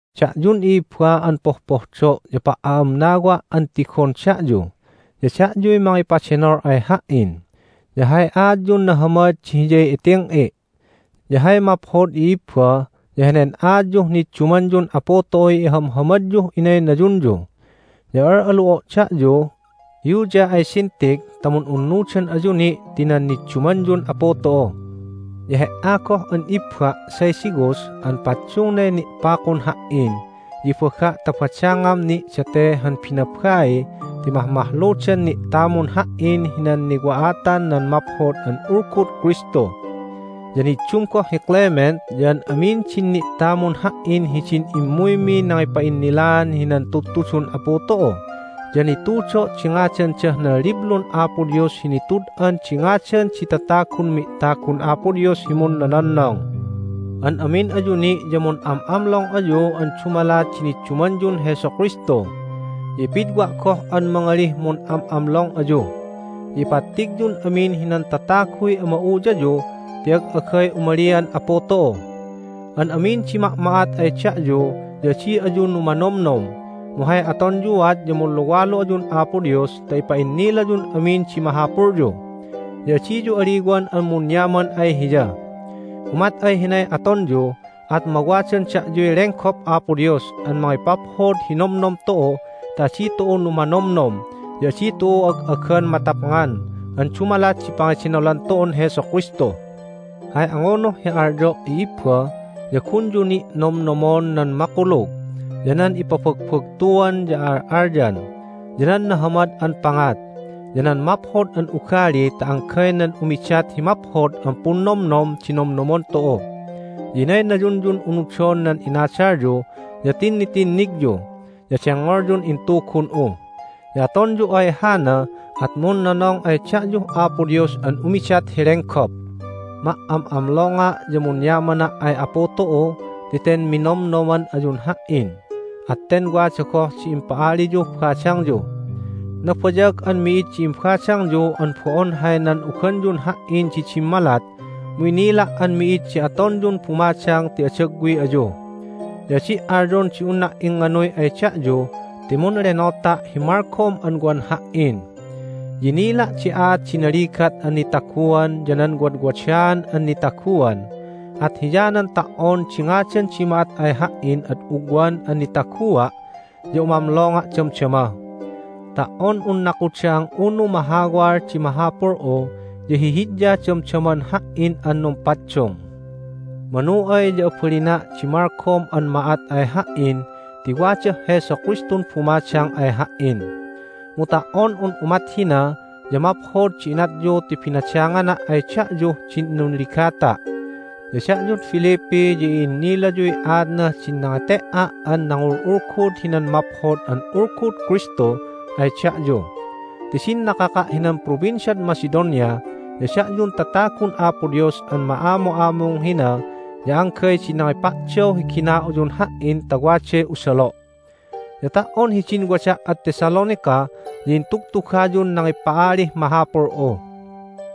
Da'yun i'ibba an popohdo' ya pa"a'amnawa' an tigon da'yu! Ya da'yuy mangipadenol ay ha"in, ya hay aatyun nahamad di hiyay iting'i'! Ya hay maphod, i'ibba, ya henen aatyuh niddumanyun Apu tu'uy ihamhamadyuh inaynayunyu. Ya al'alu'o' da'yu, Euodia ay Syntyche, ta mun'unnudan ayu ni' ti nan niddumanyun Apu tu'u. Ya he"a goh an ibba', Syzygus, an paddungnay ni'pakun ha"in ya ibaga' ta badangam ni' date han binabai ti mahmahludan ni'tamun ha"in hinan niwa'atan nan Maphod an Ulgud Kristu. Ya niddum goh hi Clement ya an amin din ni'tamun ha"in hidin immuymi nangipa'innilan hinan tudtudun Apu tu'u, ya nitudo' di ngadandah nan Liblun Apo Dios hi Nitud'an di Ngadan di Tatagun Mi'tagun Apo Dios hi Munnononnong. An amin ayu ni' ya mun'am'amlong ayu an dumalat di niddumanyun Jesu Kristu. Ya ipidwa' goh an mangalih, Mun'am'amlong ayu! Ya ipattigyun amin hinan tataguy ama'uyayu ti ag'agay umalian Apu tu'u. An amin di ma'ma'at ay da'yu ya adi ayu numanomnom, mu hay atonyuat ya munluwalu ayun Apo Dios ta ipa'innilayun amin di mahapulyu. Ya adiyu aliwan an munyaman ay Hiya. Umat ay hinay atonyu at mawadan da'yuy lenggop Apo Dios an mangipaphod hi nomnom tu'u ta adi tu'u numanomnom ya adi tu'u ag'agan matapngan an dumalat di pangedenolan tu'un Jesu Kristu. Hay angunuh hi alyo', i'ibba, ya gunyu ni' nomnomon nan makulug, ya nan ipabagbagtuan ya a'al'alyan, ya nan nahamad an pangat, ya nan maphod an ugali ta anggay nan umidat hi maphod an punnomnom di nomnomon tu'u. Ya inaynayunyun unudon nan inadalyu, ya tinnitinnigyu, ya dengngolyun intugun'u. Ya atonyu ay hana at munnonong ay da'yuh Apo Dios an umidat hi lenggop. Ma"am'amlonga' ya munyamana' ay Apu tu'u ti ten minomnoman ayun ha"in, at ten wada goh di impa'aliyuh badangyu. Nabayag an mi'id di imbadangyu an bo'on hay nan'uganyun ha"in di dimmalat, mu inila' an mi'id di atonyun bumadang ti adagwi ayu. Ya adi' alyon di unna' ingnganuy ay da'yu ti munlenota' hi malgom an wan ha"in. Ya inila' di aat di naligat an nitaguan ya nan wadwadaan an nitaguan, at hiyanan ta"on di ngadan di ma'at ay ha"in ad ugwan an nitagua' ya umamlonga' damdama. Ta"on un nakudang unu mahawal di mahapul'u ya hihidya damdaman ha"in an numpaddung. Manu ay ya abalina' di malgom an ma'at ay ha"in ti wadah Jesu Kristun bumadang ay ha"in. Mu ta"on un umat hina ya maphod di inatyu ti binadangana' ay da'yuh din nunligata'. Ya da'yud Philippi ya i'innilayuy aatnah din nangete"a' an nangul'ulgud hinan Maphod an Ulgud Kristu ay da'yu. Ti din nakaka' hinan Provinciad Macedonia ya da'yun tatagun Apo Dios an ma'amu'amung hina ya anggay di nangipa'daw hi gina'uyun ha"in ta waday usalo'. Ya ta"on hidin wada' ad Thessalonica ya intugtugayun nangipa'alih mahapul'u.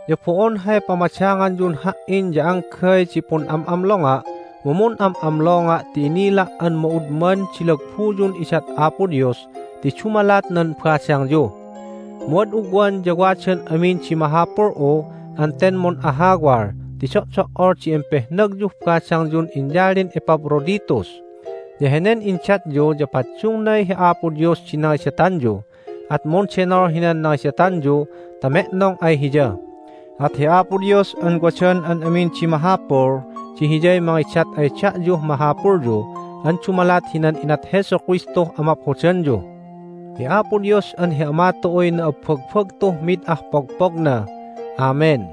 Ya bo'on hay pamadanganyun ha"in ya anggay di pun'am'amlonga' mu mun'am'amlonga' ti inila' an ma'udman di lagbuyun idat Apo Dios ti dumalat nan badangyu. Mu ad ugwan ya wadan amin di mahapul'u an ten mun'ahawal ti do'do"ol di impehnagyuh badangyun inyalin Epaphroditus! Ya henen indatyu ya paddungnay hi Apo Dios di nangidatanyu, at mundenol hinan nangidatanyu ta me'nong ay Hiya. At hi Apo Dios an wadan an amin di mahapul di Hiyay mangidat ay da'yuh mahapulyu an dumalat hinan inat Jesu Kristuh amaphodanyu! Hi Apo Dios an hi Ama tu'uy na'abbagbagtuh mid ah pogpogna! Amen!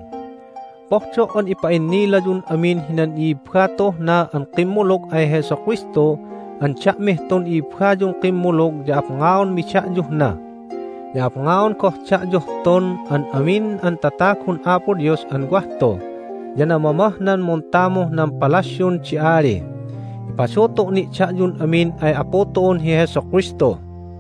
Pohdo' an ipa'innilayun amin hinan i'ibba tu'uh na an kimmulug ay Jesu Kristu an da'mih tun i'ibbayun kimmulug ya apngaonmi da'yuh na. Ya apngaon goh da'yuh tun an amin an tatagun Apo Dios an wah tu, ya namamah nan muntamuh nan palasyun di ali. Ipadutu' ni' da'yun amin ay Apu tu'un hi Jesu Kristu.